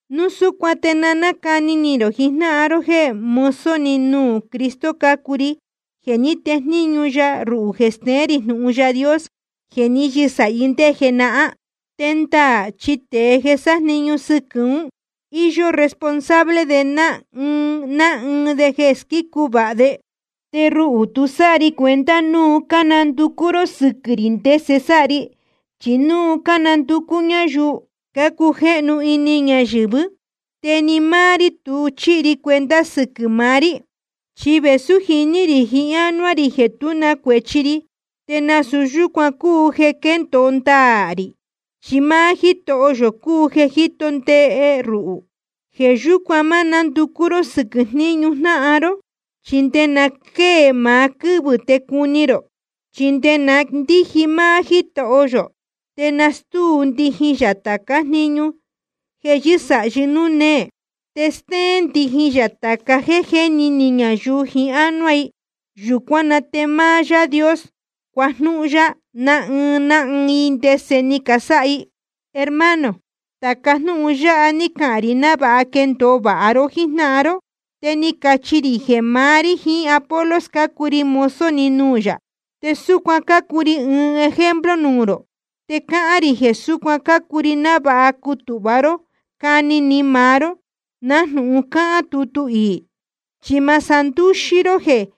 Núu súcuan te na cáni ni rō jijnáhan ró jeē mozo‑ni nuū Cristo cácuu ri, jeē ní tejníñu ya ruhū jeē steén rī jnūhun Yaā Dios jeē ní yɨsāhi ndé jenahán. Te ndaā chi tēe jeē sájniñu sɨquɨ̄ ún, íyó responsable ná ɨɨn ná ɨɨn de jeē squícu vāha de. Te ruhū tu sáha ri cuenta núu cánanducú ró sɨquɨ̄ rī ndese sáha ri, chí núu cánanducú ñáyuu cácujéhnu ini ñayɨ̄vɨ́. Te ni máá rí tu chíhi ri cuenta sɨquɨ̄ maá rí. Chi vēsú jiní rī jiín ánuá rī jeē tú na cuēchi ri, te nasūu yúcuan cúu jeē quéndōo ndaā rī, chi máá Jítoho yō cúu jeē jíto ndee ruhū. Jeē yúcuan ma nánducú ró sɨquɨ̄ jníñu jnáhan ró, chi nde na quéē maá quɨ́vɨ̄ te cuni rō. Chi nde na ndíji máá Jítoho yō te nastúu ndijin yā tācá jniñu jeē yɨ́sāhi núū néē, te stéén ndijin yā tāca jéē jéni ni ñayuu jiín ánuá i. Yūcuán na te máá Yaā Dios cuajnúhún yá ná ɨɨn ná ɨɨn i ndese ni casáha i. Hermano, tāca jnúhun yáha ní cahān rī návāha quendōo vāha ró jíjnáhan ró. Te ni cachi rī jeē maá rí jiín Apolos cácuu ri mozo‑ni nuū yā, te súcuan cácuu ri ɨɨn ejemplo nuū rō. Te cáhán rī jeē súcuan cácuu ri, návāha cutūhva ró cani ni rō maá‑ni nájnūhun cáhán tutu iī. Chi ma sandúxí ró jeē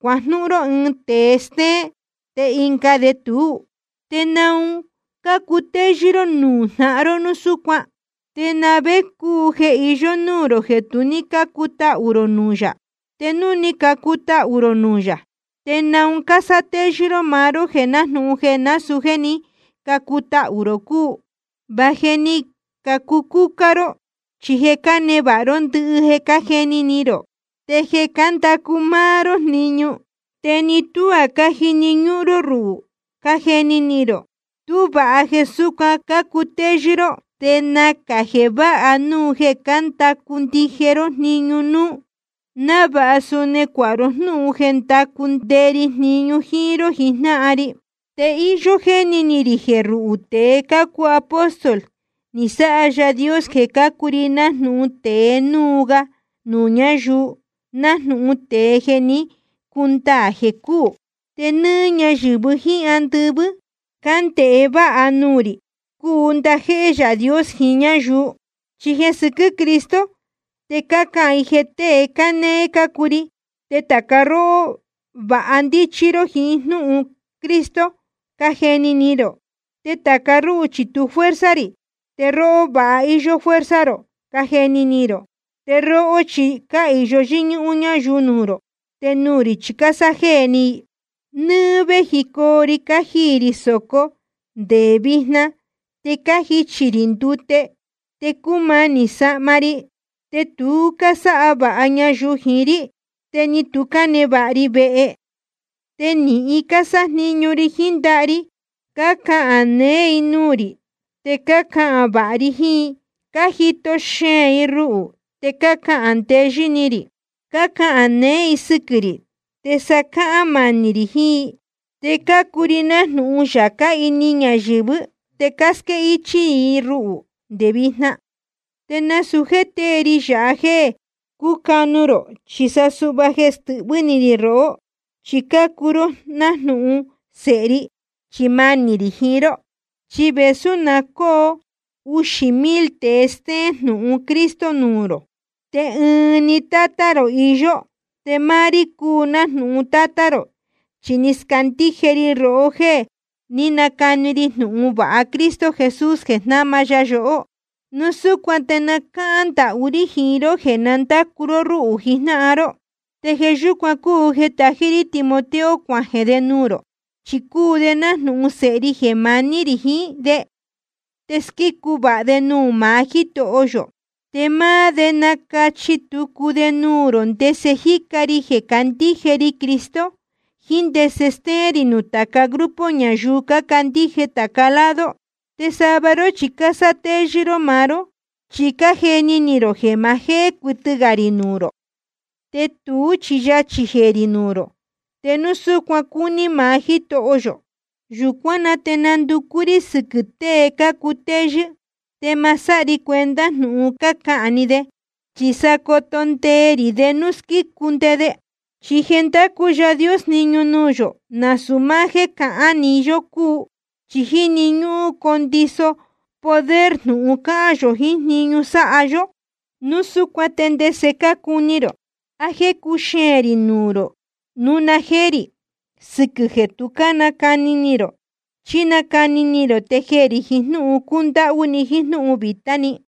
cuajnúhún ró ɨɨn tēe stéén, te ɨnga de tuú. ¿Te naun cácutéyɨ́ ró nuū jnáhan ró núu súcuan? ¿Te na vé cúu jeē iyó núū rō jeē tu ní cácutahū rō nuū yā? Te núu ni cacutahū rō nuū yā, ¿te naun cásátéyɨ́ ró maá ró jeē nájnūhun jeē nasūu jéē ní cacutahū rō cúu? Va je ni cacucúcá ró, chi je cánevāha ró ndɨhɨ, cájeni ni rō. Te je cándacu máá ró jniñu, te ni tuá cájini ñúhún ró ruhū, cájeni ni rō. Tú vāha jeē súcuan cácutéyɨ́ ró. Te nacā jeē váha núu jeē cándacu ndije nde ró jniñu núú, návāha suni cuāha ró jnúhun jeē ndacu nde ri jniñu jíín ró jijnáhan ri. Te íyó jéni ni rī jeē ruhū tēe cácuu apóstol, ni sáha Yaā Dios jeē cácuu ri nájnūhun tēe núu ga nuū ñáyuu, nájnūhun tēe jeē jé ni cundaā jeē cúū. Te nɨ́ɨ́ ñáyɨ̄vɨ jíín andɨvɨ́ cándēhe váha nuū rī, cúu ndajéhé Yaā Dios jiín ñáyuu. Chi jeē sɨquɨ́ Cristo te cácahān i jeē tée cánéé cácuu ri. Te tāca róhó va ndíchí ró jíín jnúhun Cristo, cájeni ni rō. Te tāca rúhū chi tu fuerza rī, te róhó va íyó fuerza rō, cájeni ni rō. Te róhó chi cáhīyo yɨ́ñúhún ñáyuu nuū rō, te nuū rī chi cásájéē ni i. Nɨ́ɨ́ véjicoo ri cájiī rī sōco te nde vijna. Te cájichī rī ndute, te cúmanī sahma ri, te tu cásáha vāha ñayuu jiín rí, te ni tu cánevāha ri vehe. Te nīhin cásájniñu ri jiín ndaha ri. Cácahān neé i nuū rī, te cácahān vāha ri jiín i. Cájito xeēn i ruhū, te cájendeyɨ́ ni rī. Cácahān neé i sɨquɨ̄ rī, te sa cácahān manī rī jiín i. Te cácuu ri nájnūhun yācá ini ñayɨ̄vɨ́, te cásquéhichī i ruhū nde vijna. Te nasūu jéē tée ri yāha jéē cúcanu rō, chi sa suhva jeē stɨhvɨ́ ni rī rohó, chi cácuu ró nájnūhun sēhe ri chi manī rī jiín ró. Chi vēsú na cóo uxī mil tēe stéén jnūhun Cristo nuū rō, te ɨɨn‑ni tátá rō iyó. Te máá rí cúu nájnūhun tátá rō, chi ni scandíje ri rohó jéē ní nacani ri jnūhun vāha Cristo Jesús jeē jnáma ya yohó. Núu súcuan te cáhán ndahú rí jiín ró jeē na ndácu ró rúhū jijnáhan ró. Te jeē yúcuan cúu jeē tají rí Timoteo cuajeē de nuū rō. Chi cúu de nájnūhun sēhe ri jeē maní rī jiín de, te squícu vāha de nuū maá Jítoho yō. Te máá de nacachi tucu de nuū rō ndese jíca ri jeē candíje ri Cristo, jíín ndese stéén rī nuū tāca grupo ñayuu cácandíje tāca lado. Te sava ró chi cásátéyɨ́ ró maá ró, chi cájeni ni rō jeē ma jéé cuɨtɨ gā rī nuū rō. Te tuú chi yachī jeē rī nuū rō te núu súcuan cúní maá Jítoho yō. Yūcuán na te nanducú rí sɨquɨ̄ tée cácutéyɨ́, te ma sáha ri cuenta jnūhun cácahān‑ni de, chi sa coto ndee rī de núu cuu squícu nde de. Chi jeē ndácu Yaā Dios jniñu nuū yō, nasūu máá jéē cahán iī‑ni yó cúu, chi jíni ñúhún condiso poder jnūhun cáhán yō jiín jniñu sáha yó. Núu súcuan ¿te ndese cácuni rō? ¿A jéē cuxeēn rī nuū rō núu na jéé rī, sɨquɨ̄ jeē tu cánacani ni rō, chí nacani ni rō te jeē rī jiín jnúhun cúndáhú ni jíín jnúhun vītá ni?